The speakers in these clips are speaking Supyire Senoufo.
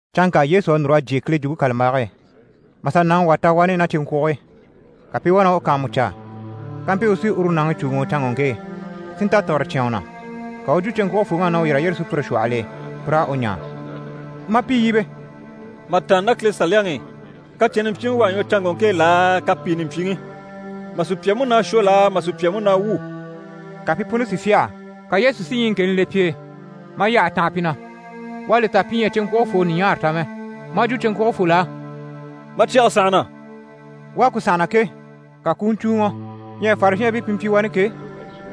Canŋka Yesu à núr'a jyè Kile Jwumpe kàlambage e, mà sà nàŋi wà ta wani ná cyeŋkwuge e. Ka pi i wá na u kàanmucaa, kampyi u sí uru nàŋi cùuŋɔ canŋɔŋke e, si nta tìgire cyán u na. Ka u u jwo cyeŋkwugefooŋ'á na u yîr'a yyére sùpyire shwɔhɔl'e, pi raa u ɲaa, maa pi yíbe: «Mà tàanna ná Kile Saliyaŋi i, kacɛnni mpyiŋi u à ɲwɔ canŋɔŋke e laa, kapiini mpyiŋi? Mà sùpya múnaa shwɔ laa, mà sùpya múnaa wwû?» Ka pi puni si fyâha. Ka Yesu si ɲyiŋkeni le pi e, maa yyahe tanha pi na, u à li ta pi ɲyɛ a cyeŋkwugefoo ɲùɲaare ta mɛ. Maa jwo cyeŋkwugefol'á: «Ma cyɛge sànhana.» U à ku sànhana ke, ka ku u ɲcùuŋɔ. Ɲyɛ Farizhɛɛnbii pi mpyi wani ke,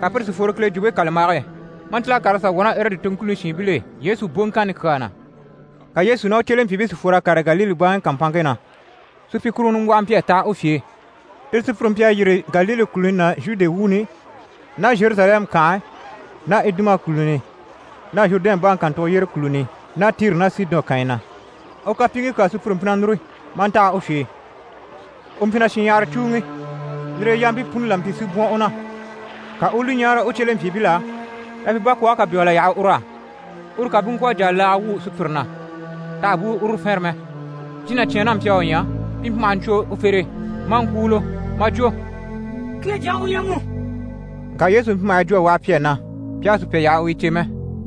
ka pire si fworo Kile Jwumpe kàlambage e, maa ntíl'a kàr'a sà wwɔ̀ ná Erɔdi toŋkuni shiinbil'e Yesu boŋkanni kyaa na. Ka Yesu ná u cyelempyiibii si fwor'a kàre Galile baŋi kàmpanŋke na. Supyikuruŋɔ nimbwɔhɔ mpyi a taha u fye e. Tire sùpyire mpyi a yîri Galile kùluni ná Zhude wuuni ná Zheruzalɛmu kànhe ná Iduma kùluni ná Zhurudɛn baŋi kàntugo yyére kùluni ná Tiri ná Sidɔn kànyi na. U kapyiiŋkii kyaa sùpyire mpyi na núru, maa ntaha u fye e. U mpyi na shinɲyahara cùuŋi, lire e yampii puni la mpyi si bwɔ̀n u na. Ka u u li ɲáare u cyelempyiibil'á na pi bakwɔɔge kà bégel'a yaha ur'á, uru ká bú ŋkwɔ̀ a jà laaga wwû sùpyire na, t'àha bú uru fɛnrɛ mɛ. Jínacyaan n'a mpyi a u ɲya, pi mpyi maha ɲcwo u fere e, maa ŋkwúulo, maa jwo: «Kile Jyaŋi u ɲyɛ mu!» Ŋka Yesu mpyi maha yi jwo a waha pi á na pi àha sùpya yaha u yi cè mɛ.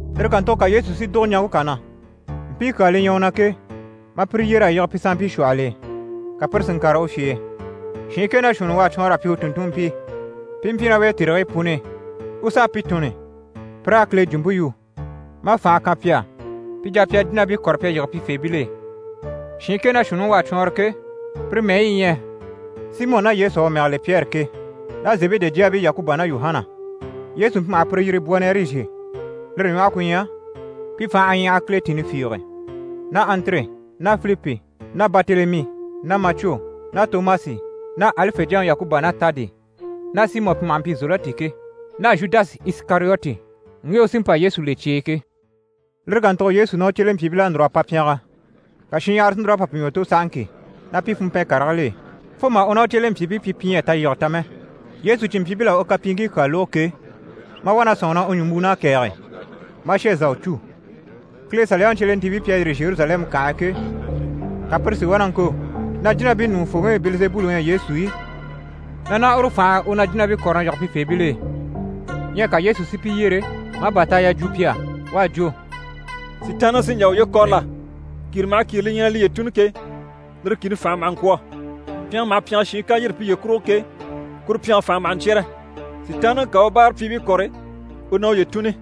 Lire kàntugo ka Yesu si dùgo ɲaŋke kà na. Mpii kyaa li ɲyɛ u na ke, maa pire yyer'a yige pi sanmpii shwɔhɔl'e, ka pire si n‑kàre u fye e. Shiin kɛ ná shuunni u à cwɔɔnr'a pyi u tùnntunmpii pi i mpyi ná u e tèrigii puni i, u s'a pi tunni pi raa Kile jwumpe yu, maa fànhe kan pi á, pi jà pi a jínabii kɔ̀re pi a yige pifeebil'e. Shiin kɛ ná shuunniŋi u à cwɔɔnrɔ ke, pire mɛyi yi ɲyɛ: Simɔ ná Yesu à u mɛge le Pyɛri ke, ná Zebede jyaabii Yakuba ná Yuhana, Yesu mpyi maha pire yiri Bwonɛrizhe, lire ɲwɔhe ku ɲyɛ pi fành'à ɲyaha kiletinni fiige, ná Andire ná Filipi ná Baritelemi ná Macwo ná Tomasi ná Alife jyaŋi Yakuba ná Taadi ná Simɔ, pi maha mpyi Zelɔti ke, ná Zhudasi Isikariyoti, ŋge u sí n‑pa Yesu le cye e ke. Lire kàntugo Yesu ná u cyelempyiibil'à núr'a pa pyɛngɛ, ka shinɲyahara si núr'a pa pi ɲwɔ tò sahaŋki ná pi funmpɛn karigil'e, fo mà u ná u cyelempyiibii pyi pi ɲyɛ a talyige ta mɛ. Yesu cìnmpyiibil'à u kapyiiŋkii kyaa lógo ke, maa wá na sɔ̂nŋi na u ɲùmbwuun'à kɛ̀ɛgɛ, maa shà zà u cû. Kile Saliyaŋi cyelentiibii pi à yîri Zheruzalɛmu kànhe e ke, ka pire si wá na ŋko na jínabii ɲùŋufooŋi Bɛlizebuli u ɲyɛ Yesu i, na ná uru fànhe e u na jínabii kɔ̀re na yige pifeebil'e. Ɲyɛ ka Yesu si pi yyere, maa bàtaaya jwo pi á. U à jwo: «Sitaanniŋi sí n‑jà uye kɔ̀rɔ la? Kìre maha kìre li ɲyɛ na liye tùnni ke, lire kìni fànhe maha ŋkwɔ̀. Pyɛngɛ maha pyɛngɛ shiin ká yîri piye kurugo ke, kuru pyɛnge fànhe maha ɲcyɛ́rɛ. Sitaanniŋi ká a u báarapyiibii kɔ̀re, u na uye tùnni.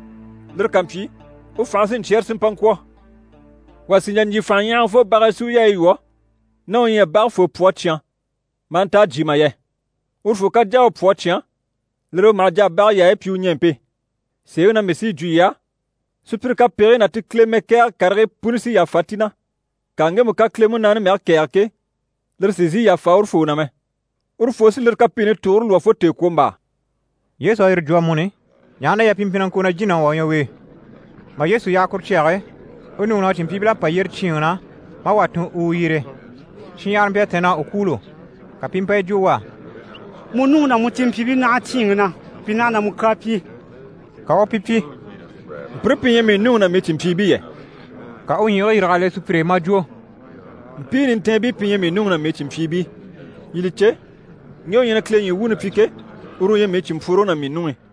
Lire ká mpyi, u fànhe sí n‑cyɛ́rɛ si mpa ŋkwɔ̀. Wà sì n‑jà n‑jyè fànhaɲyahagafoo bage e si u yaayi lwɔ́, ná u ɲyɛ a bage foo pwɔ a cyán maa nta a jyè mà yɛ. Urufoo ká jà a u pwɔ a cyán, lire e u maha jà a bage yaayi pyi u ɲɛɛmpe. Sèeŋi na mii sí yi jwo yii á, sùpyire kapegigii ná ti Kile mɛkɛɛgɛ karigii puni sí yàfa ti na, ŋka ŋgemu ká Kile Munaani mɛge kɛ̀ɛge ke, lire sì n‑sìi yàfa urufoo na mɛ, urufoo sí lire kapiini tugure lwɔ́ fo tèekwombaa.» Yesu à yire jwo amuni, ɲaha na yɛ pi mpyi na ŋko na jínaŋi wà u ɲyɛ u e. Mà Yesu yaha kuru cyage e, u nuŋi ná u cìnmpyiibil'à pa yyére cyíinŋi na, maa wà tun u u yyere. Shinɲyahara mpyi a tɛ̀nn'a u kwûulo, ka pi i mpa yi jwo u á: «Mu nuŋi ná mu cìnmpyiibii naha cyíinŋi na, pi naha na mu kyaa pyi.» Ka u u pi pyi: «Mpire pi ɲyɛ mii nuŋi ná mii cìnmpyiibii yɛ?» Ka u u ɲyiigii yîrig'a le sùpyire e, maa jwo: «Mpii nintɛɛnbii pi ɲyɛ mii nuŋi ná mii cìnmpyiibii. Yii li cè, ŋge u ɲyɛ na Kile ɲyii wuuni pyi ke, uru u ɲyɛ mii cìnmpworoŋi ná mii nuŋi.»